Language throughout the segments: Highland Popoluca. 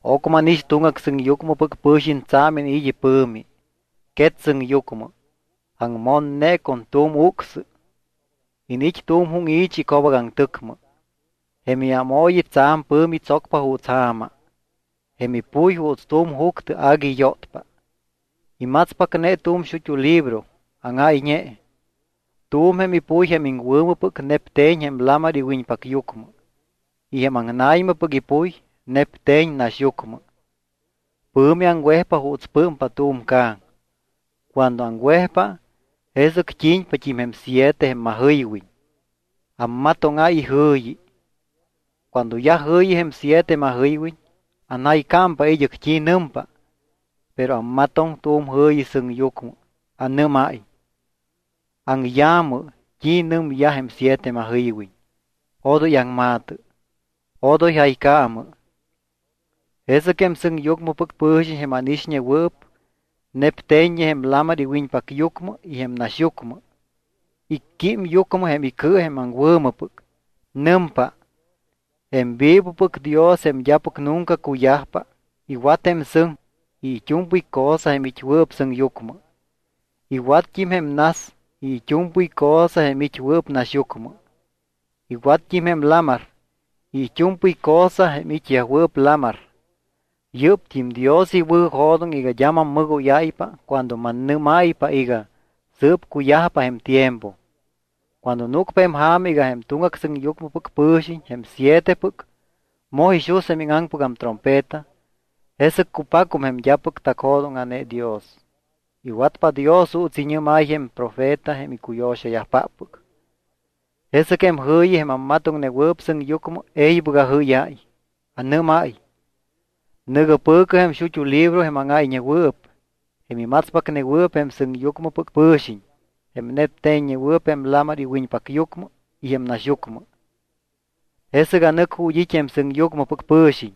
Ocmɨ ánix tuŋgac sɨŋyucmɨpɨc pɨ̱xiñ tsa̱m iniit́ ipɨ̱mi, quet sɨŋyucmɨ. Aŋmonne con tu̱m ucsɨ. Iniit́ tu̱m júŋi̱chi ico̱bacaŋtɨcmɨ. Jém iámooyi tsa̱m pɨ̱mi tsocpa juuts ja̱ma. Jém ipuy juuts tu̱m juctɨ agui yótpa. Imatspacne tu̱m xut́u libro áŋáyñe. Tu̱m jém ipuy jém iŋwɨ̱mɨpɨc nepte̱ñ jém lamar iwiñpacyucmɨ y jém aŋna̱ymɨpɨc ipuy nepte̱ñ naxyucmɨ. Pɨ̱mi aŋwejpa juuts pɨ́mpa tu̱m ca̱ŋ. Cuando aŋwejpa, jesɨc t́i̱ñpat́im jém siete jém majɨywiñ, ammatóŋáy ijɨ̱yi. Cuando yaj jɨ̱yi jém siete majɨywiñ, anjaycámpa id́ɨc t́i nɨmpa. Pero ammatoŋ tu̱m jɨ̱yi sɨŋyucmɨ. Anɨ́máy: —Aŋya̱mɨ t́i nɨmyaj jém siete majɨywiñ, odoy aŋma̱tɨ. Odoy jaycaamɨ. Jesɨc jém sɨŋyucmɨpɨc pɨ̱xiñ jém ánixñewɨɨp nepte̱ññe jém lamar iwiñpacyucmɨ y jém naxyucmɨ, icquím yucmɨ jém icɨ jém aŋwɨ̱mɨpɨc. Nɨmpa: —Jém vivopɨc Dios jém d́apɨc nunca cuyajpa, iwat jém sɨŋ y it́u̱mpɨy cosa jém it́wɨɨp sɨŋyucmɨ, iwatt́im jém nas y it́u̱mpɨy cosa jém it́wɨɨp naxyucmɨ, iwatt́im jém lamar y it́u̱mpɨy cosa jém it́yajwɨɨp lamar. Yɨ́pt́im Dios iwɨ̱jo̱doŋ iga d́a mammɨgóyáypa cuando mannɨ́máypa iga sɨɨp cuyajpa jém tiempo. Cuando núcpa jém ja̱ma iga jém tuŋgac sɨŋyucmɨpɨc pɨ̱xiñ, jém sietepɨc, moj ixus jém íŋaŋpɨgam trompeta, jesɨc cupacum jém d́apɨc tacjo̱dóŋa̱ne Dios. Iwatpa Dios juuts iñɨ́máy jém profeta jém icuyo̱xayajpáppɨc. Jesɨc jém jɨ̱yi jém ammatoŋnewɨɨp sɨŋyucmɨ e̱ybɨc ajɨ́yáy. Anɨ́máy: —Nɨ̱gɨ pɨ̱cɨ jém xut́u libro jém áŋáyñewɨɨp, jém imatspacnewɨɨp jém sɨŋyucmɨpɨc pɨ̱xiñ, jém nepte̱ññewɨɨp jém lamar iwiñpacyucmɨ y jém naxyucmɨ. Jesɨc anɨc ju̱t́ it́ jém sɨŋyucmɨpɨc pɨ̱xiñ.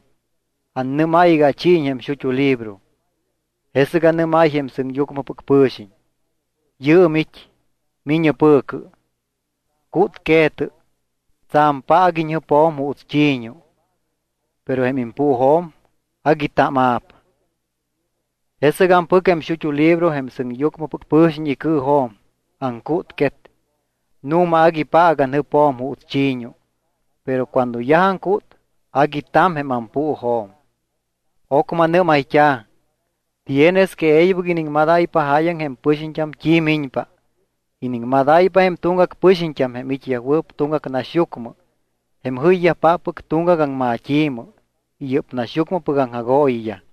Annɨ́máy iga achiiñ jém xut́u libro. Jesɨc anɨ́máy jém sɨŋyucmɨpɨc pɨ̱xiñ: —Yɨɨm it́. Mi̱ñɨ pɨ̱cɨ. Cútque̱tɨ. Tsa̱m paac iñjɨpjo̱m juuts chi̱ñu. Pero jém impuujo̱m agui taama̱p. Jesɨc ampɨc jém xut́u libro jém sɨŋyucmɨpɨc pɨ̱xiñ icɨɨjo̱m. Aŋcútquet. Nu̱ma agui paac anjɨpjo̱m juuts chi̱ñu. Pero cuando yaj aŋcút agui ta̱m jém ampuujo̱m. Ocmɨ anɨ́mayt́a̱: —Tienes que e̱ybɨc iniŋmadáypa jáyaŋ jém pɨxiñt́am t́i miñpa. Iniŋmadáypa jém tuŋgac pɨxiñt́am, jém it́yajwɨɨp tuŋgac naxyucmɨ, jém jɨyyajpáppɨc tuŋgac aŋmat́i̱mɨ y yɨ́p naxyucmɨpɨc aŋjagooyiyaj.